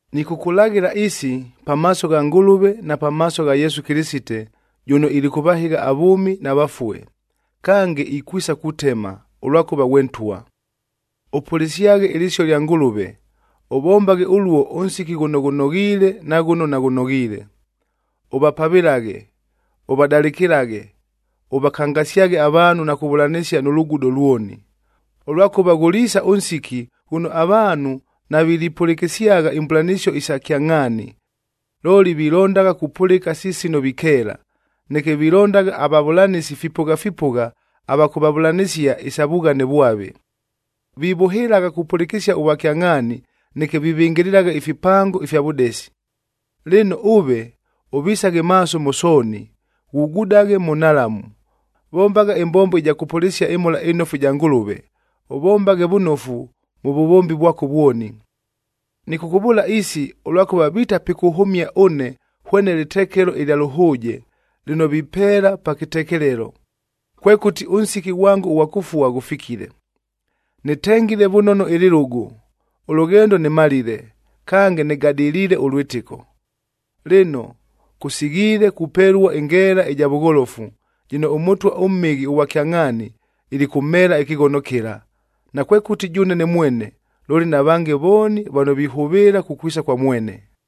Nɨkʉkʉlaghɨla isi, pamaaso gha Ngʉlʉve na pamaaso gha Yesu Kɨlɨsite, jʉno ilikʉvahɨgha avʉʉmi na vafue, kange ikwisa kutema, ʉlwakʉva ghwe Ntwa. Ʉpʉlɨsyaghe ɨlɨsio lya Ngʉlʉve, ʉvombaghe ʉluo ʉnsiki ghʉno ghʉnoghiile na ghʉno naghʉnoghiile. Ʉvapavɨlaghe, ʉvadalɨkɨlaghe, ʉvakangasyaghe avaanhu na kuvʉlanɨsia nʉ lugudo lwoni. Ʉlwakʉva ghʉliisa ʉnsiki, ghʉno avaanhu navilipʉlɨkɨsyagha imbʉlanɨsio isa kyangʼhaani. Looli, vilondagha kupʉlɨka si sino vikeela, neke vilondagha avavʉlanɨsi fipʉgha fipʉgha ava kʉvavʉlanɨsia isa vughane vwave. Vivʉhɨlagha kupʉlɨkɨsia ʉvwakyangʼhaani, neke vivɨngɨlɨlagha ifipango ifya vʉdesi. Lɨno ʉve, ʉvisaghe maaso mʉ sooni, ghugudaghe mʉ nhalamu, vombagha ɨmbombo ɨja kʉpʉlɨsia ɨMhola ɨNofu ɨja Ngʉlʉve, ʉvombaghe vʉnofu mʉ vʉvombi vwako vwoni. Nɨkʉkʉvʉʉla isi, ʉlwakʉva vita pikʉhʉmia ʉne hwene lɨtekelo ɨlya lʉhʉʉje, lɨno vipeela pa kɨtekelelo.a Kwekʉti, ʉnsiki ghwango ʉghwa kʉfua ghʉfikile. Nɨtengile vʉnono ɨlɨlʉgʉ, ʉlʉghendo nɨmalile, kange nɨgadɨliile ʉlwɨtɨko. Lɨno, kʉsighiile kupelua ɨngeela ɨja vʉgholofu, jɨno ʉMʉtwa ʉMhɨghi ʉghwa kyangʼhaani ilikʉmheela ɨkɨghono kɨla, nakwekʉti jʉʉne ne mwene, looli na vange vooni vano vihʉvɨɨla kukwisa kwa mwene.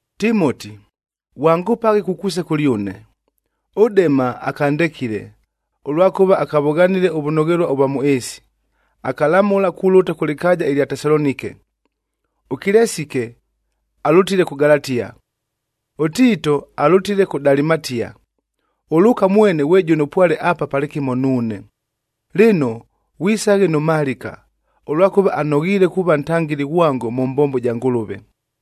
Timoti, ghwangʉpaghe kukwisa kʉlyʉne. ɄDema akandekile, ʉlwakʉva akavʉghanile ʉvʉnoghelua ʉvwa mʉ ɨɨsi, akalamʉla kulʉta kʉ lɨkaaja ɨlya Tesalonike. ɄKilesike alʉtile kʉ Galatia, ʉTiito alʉtile kʉ Dalimatia. ɄLʉʉka mwene ghwe jʉno pwale apa palɨkɨmo nuune. Lɨno, ghwisaghe nʉ Malɨka, ʉlwakʉva anoghiile kuuva ntangɨli ghwango mʉ mbombo ja Ngʉlʉve.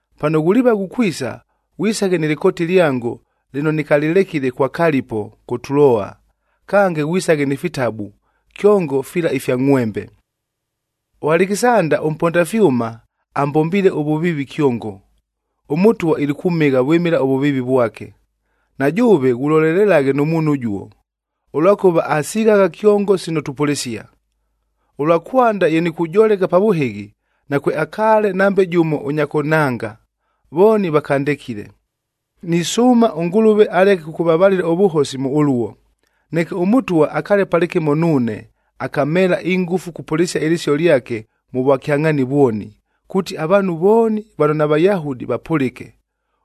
Pano ghuliiva ghukwisa, ghwisaghe nɨ lɨkooti lyango lɨno nɨkalɨlekile kwa Kalipo kʉ Tuloa, kange ghwisaghe ni fitabu, kyongo fila ifya ngʼhwembe. ɄAlekisanda ʉmponda fyʉma, ambombiile ʉvʉviivi kyongo. ɄMʉtwa ilikʉmhɨgha vwɨmɨla ʉvʉviivi vwake. Na jʉʉve ghulolelelaghe nʉ muunhu ʉjuo, ʉlwakʉva asighagha kyongo sino tupʉlɨsia. Ʉlwa kwanda ye nikujoleka pa vʉhɨghi, nakweakaale nambe jʉmo ʉnya kʉnhanga, vooni vakandekile. Nisʉʉma ʉNgʉlʉve aleke kʉkʉvavalɨla ʉvʉhosi mʉ ʉluo. Neke ʉMʉtwa akaale palɨkɨmo nuune, akamheela ingʉfu kupʉlɨsia ɨlɨsio lyake mʉ vwakyangʼhaani vwoni, kuuti avaanhu vooni vano naVayahudi vapʉlɨke.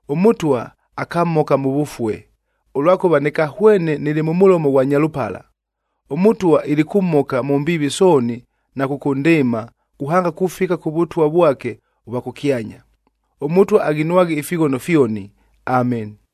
ɄMʉtwa akamhoka mʉ vʉfue, ʉlwakʉva nɨkahwene nɨlɨ mʉ mʉlomo ghwa nyalʉpala. ɄMʉtwa ilikʉmhoka mʉ mbiivi sooni na kʉkʉndɨɨma, kuhanga kufika kʉ Vʉtwa vwake ʉvwa kʉkyanya. ɄMʉtwa aghinwaghe ifighono fyoni. Ameni.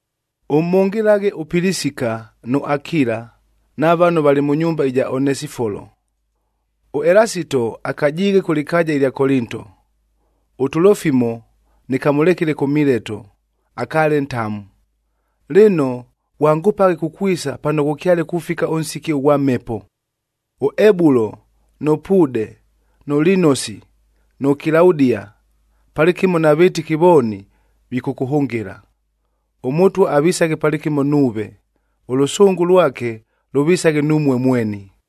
Ʉmhʉngɨlaghe ʉPilisika nʉ Akila na vano valɨ mʉ nyumba ɨja Onesifolo. ɄElasito akajiighe kʉ lɨkaaja ɨlya Kolinto. ɄTulofimo nɨkamʉlekile kʉ Mileto, akaale ntamu. Lɨno, ghwangʉpaghe kukwisa pano ghʉkyale kufika ʉnsiki ʉghwa mhepo. ɄEbulo nʉ Puude, nʉ Linosi, nʉ Kilaudia, palɨkɨmo na vɨtɨki vooni, vikʉkʉhʉngɨla. ɄMʉtwa avisaghe palɨkɨmo nuuve. Ʉlʉsʉngʉ lwake lʉvisaghe numue mweni.